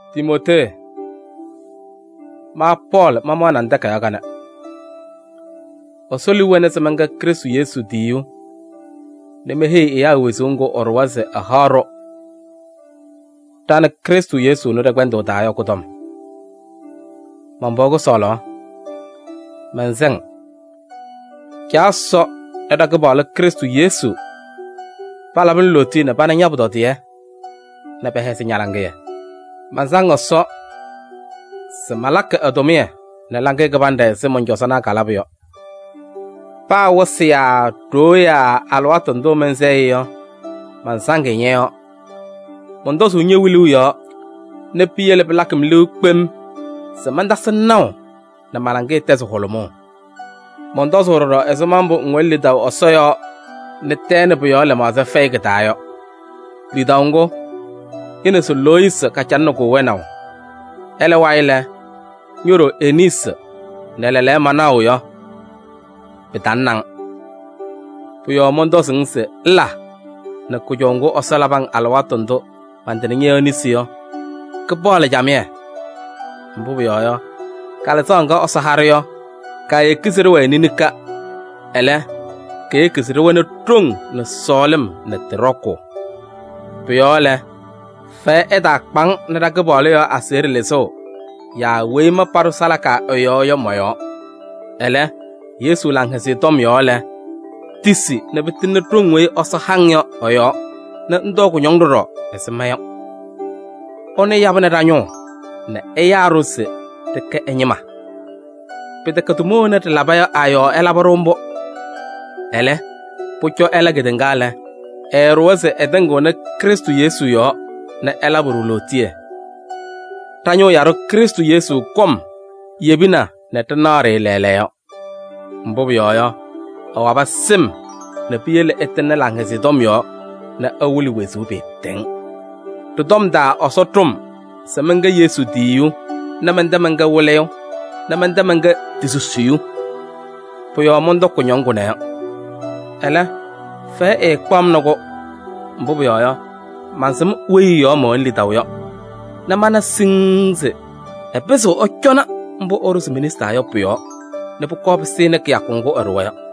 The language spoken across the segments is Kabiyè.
Timootee! Ma Pɔɔlɩ mamaɣnɩ-ŋ takayaɣ kanɛ. Ɛsɔ liu wɛnɩ se mɛnkɛ Krɩstʋ Yesu tiyiyu nɛ meheyi ɛyaa wezuu ŋgʋ ɛɖʋwa se ɛhaɣ-ɖʋ ɖa nɛ Krɩstʋ Yesu ɛnʋ ɖɛ-kpɛndʋʋ taa yɔ kʋ-tɔm. Man-pɩɣa kʋsɔɔlaɣ! Mɛnsɛ-ŋ: Caa Ɛsɔ nɛ ɖa-Kɩpaɣlʋ Krɩstʋ Yesu palabɩ-ŋ lootiye nɛ pana ña-pʋtɔdɩyɛ nɛ pɛhɛzɩ ña-laŋɩyɛ. Mansaŋ Ɛsɔ se malakɩ ɛ-tʋmɩyɛ nɛ laŋɩyɛ kɩbanɖɛ ɛzɩ mɔn-cɔzɔnaa kalabʋ yɔ. Paa wɩsɩ yaa ɖoo yaa alɩwaatʋ ndʋ mɛnsɛɣ-ɩ yɔ, mansaŋ-ɩ ñɔ-yɔɔ. Mɔntɔzʋʋ ñe-wiluu yɔɔ nɛ piyele pɩlakɩ-m liu kpem se mantasɩ-ŋ naʋ nɛ ma-laŋɩyɛ tɛzɩ hʋlʋmʋʋ. Mɔntɔzʋʋ ɖɔɖɔ ɛzɩma mbʋ ŋwɛnɩ lidaʋ Ɛsɔ yɔɔ nɛ tɛɛ nɛ pʋ-yɔɔ lɩmaɣza fɛyɩ kɩ-taa yɔ. Lidaʋ ŋgʋ, ñe-neze Loyisi kacalɩnɩ-kʋ wɛnaʋ, ɛlɛ wayɩ lɛ, ño-ɖoo Eniisi nɛ lɛɛlɛɛyɔ manaɣʋ yɔ, pɩtalɩnɩ-ŋ. Pʋ-yɔɔ mɔntɔzʋʋ-ŋ se ŋla nɛ kʋjɔʋ ŋgʋ Ɛsɔ labɩ-ŋ alɩwaatʋ ndʋ mantɩnɩ ñɔ-yɔɔ nesi yɔ, kɩpaɣlɩ camɩyɛ. Mbʋ pʋyɔɔ yɔ, Kalɩzaɣ ŋga Ɛsɔ ha-ɖʋ yɔ, kaayeki se ɖɩwɛɛ ninika, ɛlɛ, keyeki se ɖɩwɛnɩ ɖoŋ nɛ sɔɔlɩm nɛ tɩ ɖɔkʋʋ. Pʋ-yɔɔ lɛ, fɛyɛ ɛtaakpa-ŋ nɛ ɖa-Kɩpaɣlʋ yɔɔ aseɣɖe lɩzʋʋ yaa weyi ma paɖʋ salaka ɛ-yɔɔ yɔ mɔ-yɔɔ. Ɛlɛ, Yesu Laŋhɛzɩyɛ Tɔm yɔɔ lɛ, tisi nɛ pɩtɩŋnɩ ɖoŋ weyi Ɛsɔ ha-ŋ yɔ ɛ-yɔɔ nɛ ŋtɔɔ kʋñɔŋ ɖɔɖɔ ɛzɩ ma yɔ. Ɛnʋ yabɩnɩ ɖa-ñʋʋ nɛ ɛyaa-ɖʋ se ɖɩkɛ ɛ-ñɩma. Pɩtɛkɛ tʋma wena ɖɩlaba yɔ a-yɔɔ ɛlabɩ-ɖʋ mbʋ. Ɛlɛ, pʋcɔ ɛla kedeŋa lɛ, ɛɛɖʋwa se ɛtɩŋɩɣnɩ Krɩstʋ Yesu yɔɔ nɛ ɛlabɩ-ɖʋ lootiye. Ɖa-Ñʋʋ Yaɖʋ Krɩstʋ Yesu kɔm yebina nɛ ɖɩnaɣ-ɖɩ lɛɛlɛɛyɔ. Mbʋ pʋyɔɔ yɔ, ɛwabɩ sɩm nɛ piyele ɛtɩŋnɩ Laŋhɛzɩyɛ Tɔm yɔɔ nɛ ɛwɩlɩ wezuu pɩɩtɛŋ. Tɩ-tɔm taa Ɛsɔ ɖʋ-m se mɛnkɛ Yesu tiyiyu nɛ mɛntɛ mɛnkɛ wɩlɩyʋ nɛ mɛntɛ mɛnkɛ ti-susiyu. Pʋ-yɔɔ mɔntɔkɩ kʋñɔŋ kʋnɛ yɔ. Ɛlɛ, fɛyɛ ɛɛkpaɣ-m nɛ kʋ, mbʋ pʋyɔɔ yɔ, mansɩm weyi ɛ-yɔɔ mɛwɛnɩ lidaʋ yɔ nɛ mana siŋŋ se ɛpɩzɩɣ ɛcɔnɩ mbʋ ɛɖʋzɩ me-nesi taa yɔ pʋ-yɔɔ nɛ pʋkɔɔ pɩsɩnɩ kɩyakʋ ŋgʋ ɛɖʋwa yɔ.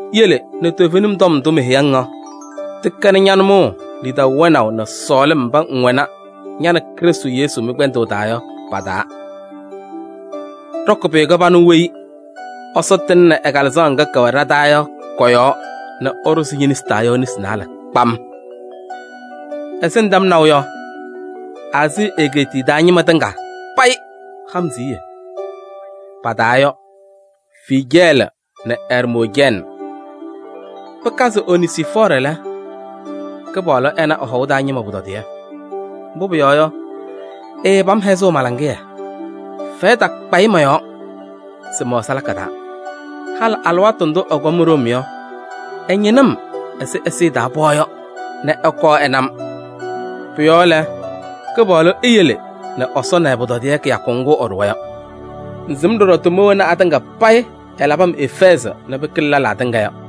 Yele nɛ toovenim tɔm ndʋ meheyi-ŋ yɔ, tɩkɛnɩ ña-nʋmɔʋ lidaʋ wɛnaʋ nɛ sɔɔlɩm mba ŋwɛnɩ ña nɛ Krɩstʋ Yesu mɩ-kpɛndʋʋ taa yɔ pa-taa. Ɖɔkɩ pʋyʋ kɩbanʋ weyi Ɛsɔ tɩŋnɩ ɛ-Kalɩzaɣ ŋga kɛwɛ ɖa-taa yɔ kɔ-yɔɔ nɛ ɛɖʋzɩ ñe-nesi taa yɔ nesi naalɛ kpam. Ɛzɩ ŋtɛm naʋ yɔ, Aazii egeetiye taa ñɩma tɩŋa payɩ ha-m siɣye, pa-taa yɔ: Fiijɛɛlɩ nɛ Ɛrmoojɛɛnɩ. Pɩkazɩ Onezifɔɔrɩ lɛ, Kɩpaɣlʋ ɛna ɛ-hɔʋ taa ñɩma pʋtɔdɩyɛ. Mbʋ pʋyɔɔ yɔ, ɛɛpam hɛzʋʋ ma-laŋɩyɛ, fɛyɛ takpa-ɩ mɔ-yɔɔ se mɛwɛ salaka taa. Halɩ alɩwaatʋ ndʋ ɛkɔm Room yɔ, ɛñɩnɩ-m ɛzɩ ɛzɩyɛ taa pɩɣa yɔ nɛ ɛkɔɔ ɛna-m. Pʋ-yɔɔ lɛ, Kɩpaɣlʋ eyele nɛ Ɛsɔ na ɛ-pʋtɔdɩyɛ kɩyakʋ ŋgʋ ɛɖʋwa yɔ. Ŋsɩm ɖɔɖɔ tʋma wena atɩŋa payɩ ɛlabɩ-m Efɛɛzɩ yɔ nɛ pɩkɩlɩ lɛlaa tɩŋa.